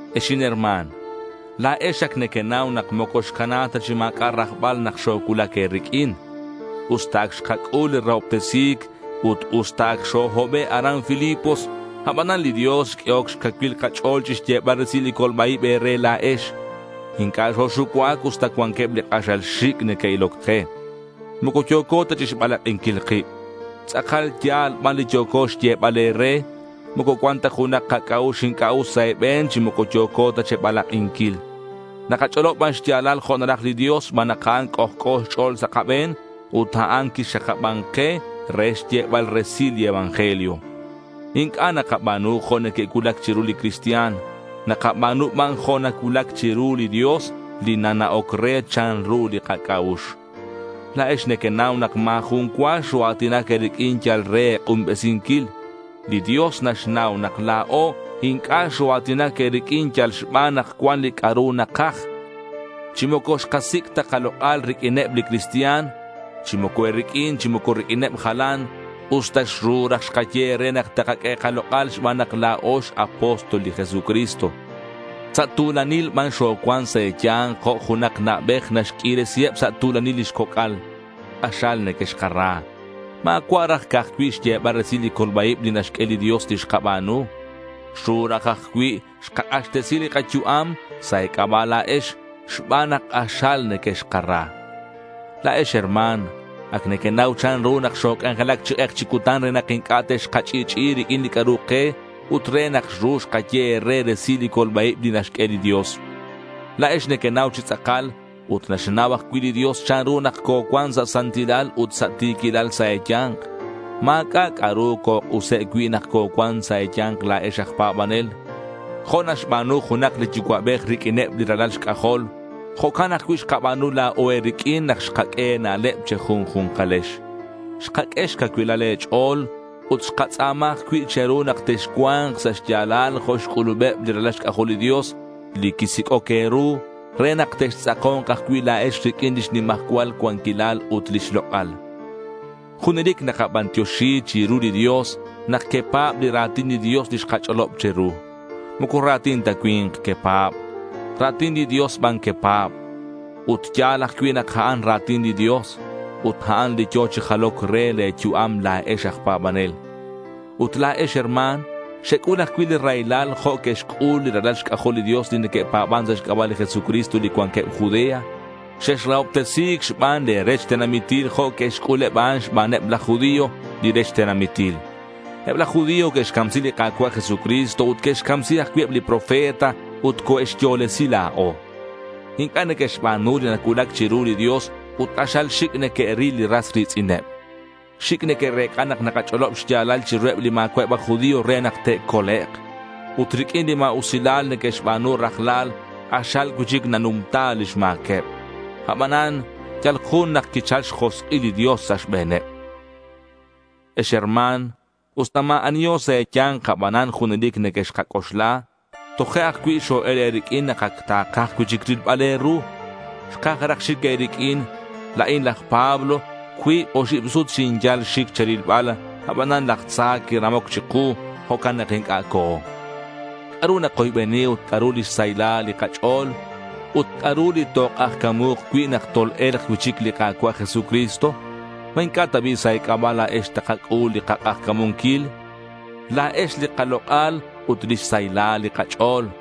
Ex inherma̱n, la̱ex ac nequenau nak moco xcana ta chi ma̱c'a' rajbal nak xocuulac e̱riq'uin. Usta ac xkac'ul li rahobtesi̱c ut usta ac xohobe' aran Filipos, abanan li Dios xq'uehoc xcacuil kach'o̱l chixyebal resil li colba-ib e̱re la̱ex. Inc'a' xoxucuac usta cuanqueb li k'axal xic' neque'iloc ke. Moco yo̱co ta chixbalak'inquil kib. Tz'akal ya̱l ban li yo̱co xyebal e̱re. Moco cuan ta junak kac'a'ux inc'a' us sa' e̱be̱n, chi moco yo̱co ta che̱balak'inquil. Nakach'olob ban xya̱lal jo' naraj li Dios xban nak a'an c'ojc'o xch'o̱l sa' kabe̱n ut a'an quixakaban ke re xyebal resil li evangelio. Inc'a' nakaba̱nu jo' neque'cuulac chiru li cristian. Nakaba̱nu ban jo' nacuulac chiru li Dios li nana'oc re chanru li kac'a'ux. La̱ex nequenau nak ma̱ jun cua xoa̱tinac e̱riq'uin yal re e̱k'unbesinquil. Li Dios naxnau nak la̱o inc'a' xoa̱tinac e̱riq'uin yal xban nak cuan li c'a'ru nakaj. Chi moco xkasic' ta kalok'al riq'uineb li cristian, chi moco e̱riq'uin chi moco riq'uineb jalan, usta xru raj xkaye e̱re nak te̱q'ue kalok'al xban nak la̱o x-apóstol li Jesucristo. Sa' tu̱lanil ban xocuan sa' e̱ya̱nk jo' junak na'bej naxq'uiresiheb sa' tu̱lanil lix coc'al. K'axal nequexkara. Ma̱cua' raj ca'aj cui' xyebal resil li colba-ib li naxq'ue li Dios li xkaba̱nu. Xru aj raj cui' xkak'axtesi li kayu'am sa' e̱c'aba' la̱ex xban nak k'axal nequexkara. La̱ex herma̱n, ac nequenau chanru nak xoc'anjelac chi k'ek chi cutan re nak inc'a' texkach'i'ch'i'i riq'uin li c'a'ru ke ut re nak xru xkaye e̱re resil li colba-ib li naxq'ue li Dios. La̱ex nequenau chi tz'akal, ut naxnau ajcui' li Dios, chanru nak cocuan sa' santilal ut sa' ti̱quilal sa' e̱ya̱nk. Ma̱c'a' c'a'ru cok'use' cui' nak cocuan sa' e̱ya̱nk la̱ex aj pa̱banel. Jo' naxba̱nu junak li yucua'bej riq'uineb li ralal xc'ajol, jo'can ajcui' xkaba̱nu la̱o e̱riq'uin nak xkaq'ue e̱na'leb che̱junju̱nkalex. Xkaq'ue xcacuilal e̱ch'o̱l ut xkatz'a̱ma ajcui' che̱ru nak texcua̱nk sa' xya̱lal jo' xc'ulubeb li ralal xc'ajol li Dios li quisic'oc e̱ru re nak textz'ako̱nk ajcui' la̱ex riq'uin lix nimajcual cuanquilal ut lix lok'al. Junelic nakabantioxi chiru li Dios nak quepa̱b li ra̱tin li Dios li xkach'olob che̱ru. Moco ra̱tin cui̱nk ta quepa̱b. Ra̱tin li Dios ban quepa̱b. Ut ya̱l ajcui' nak a'an ra̱tin li Dios. Ut a'an li yo̱ chi jaloc re le̱ yu'am la̱ex aj pa̱banel. Ut la̱ex herma̱n xec'ul ajcui' li raylal jo' que'xc'ul li ralal xc'ajol li Dios li neque'pa̱ban sa' xc'aba' li Jesucristo li cuanqueb Judea. Xexrahobtesi̱c xban le̱ rech tenamitil jo' que'xc'ul eb a'an xbaneb laj judío, li rech tenamitil. Eb laj judío que'xcamsi li Ka̱cua' Jesucristo ut que'xcamsi ajcui' eb li profeta ut coe'xyo̱lesi la̱o. Inc'a' neque'xba̱nu li nacuulac chiru li Dios ut k'axal xic' neque'ril li ras ri̱tz'ineb. Xic' neque'rec'a nak nakach'olob xya̱lal chiruheb li ma̱cua'eb aj judío re nak te'colek'. Ut riq'uin li ma̱usilal neque'xba̱nu rajlal, k'axal cui'chic nanumta lix ma̱queb. Abanan yal jun nak quichal xjosk'il li Dios sa' xbe̱neb. Ex herma̱n, usta ma̱ aniho sa' e̱ya̱nk, abanan junelic nequexkac'oxla. Toje' ajcui' xo-el e̱riq'uin nak ac takaj cui'chic rilbal e̱ru. Xkaj raj xic e̱riq'uin. La̱in laj Pablo. Cuib oxib sut xinyal xic che̱rilbal. Abanan laj tza quiramoc chiku. Jo'can nak inc'a' co̱o. ¿C'a'ru nakoybeni ut c'a'ru lix saylal li kach'o̱l? ¿Ut c'a'ru li tok'ajca̱mu̱k cui' nak tol-e̱lk cui'chic li Ka̱cua' Jesucristo? ¿Ma inc'a' ta bi' sa' e̱c'aba' la̱ex takac'ul li kak'ajca̱munquil? La̱ex li kalok'al ut lix saylal li kach'o̱l.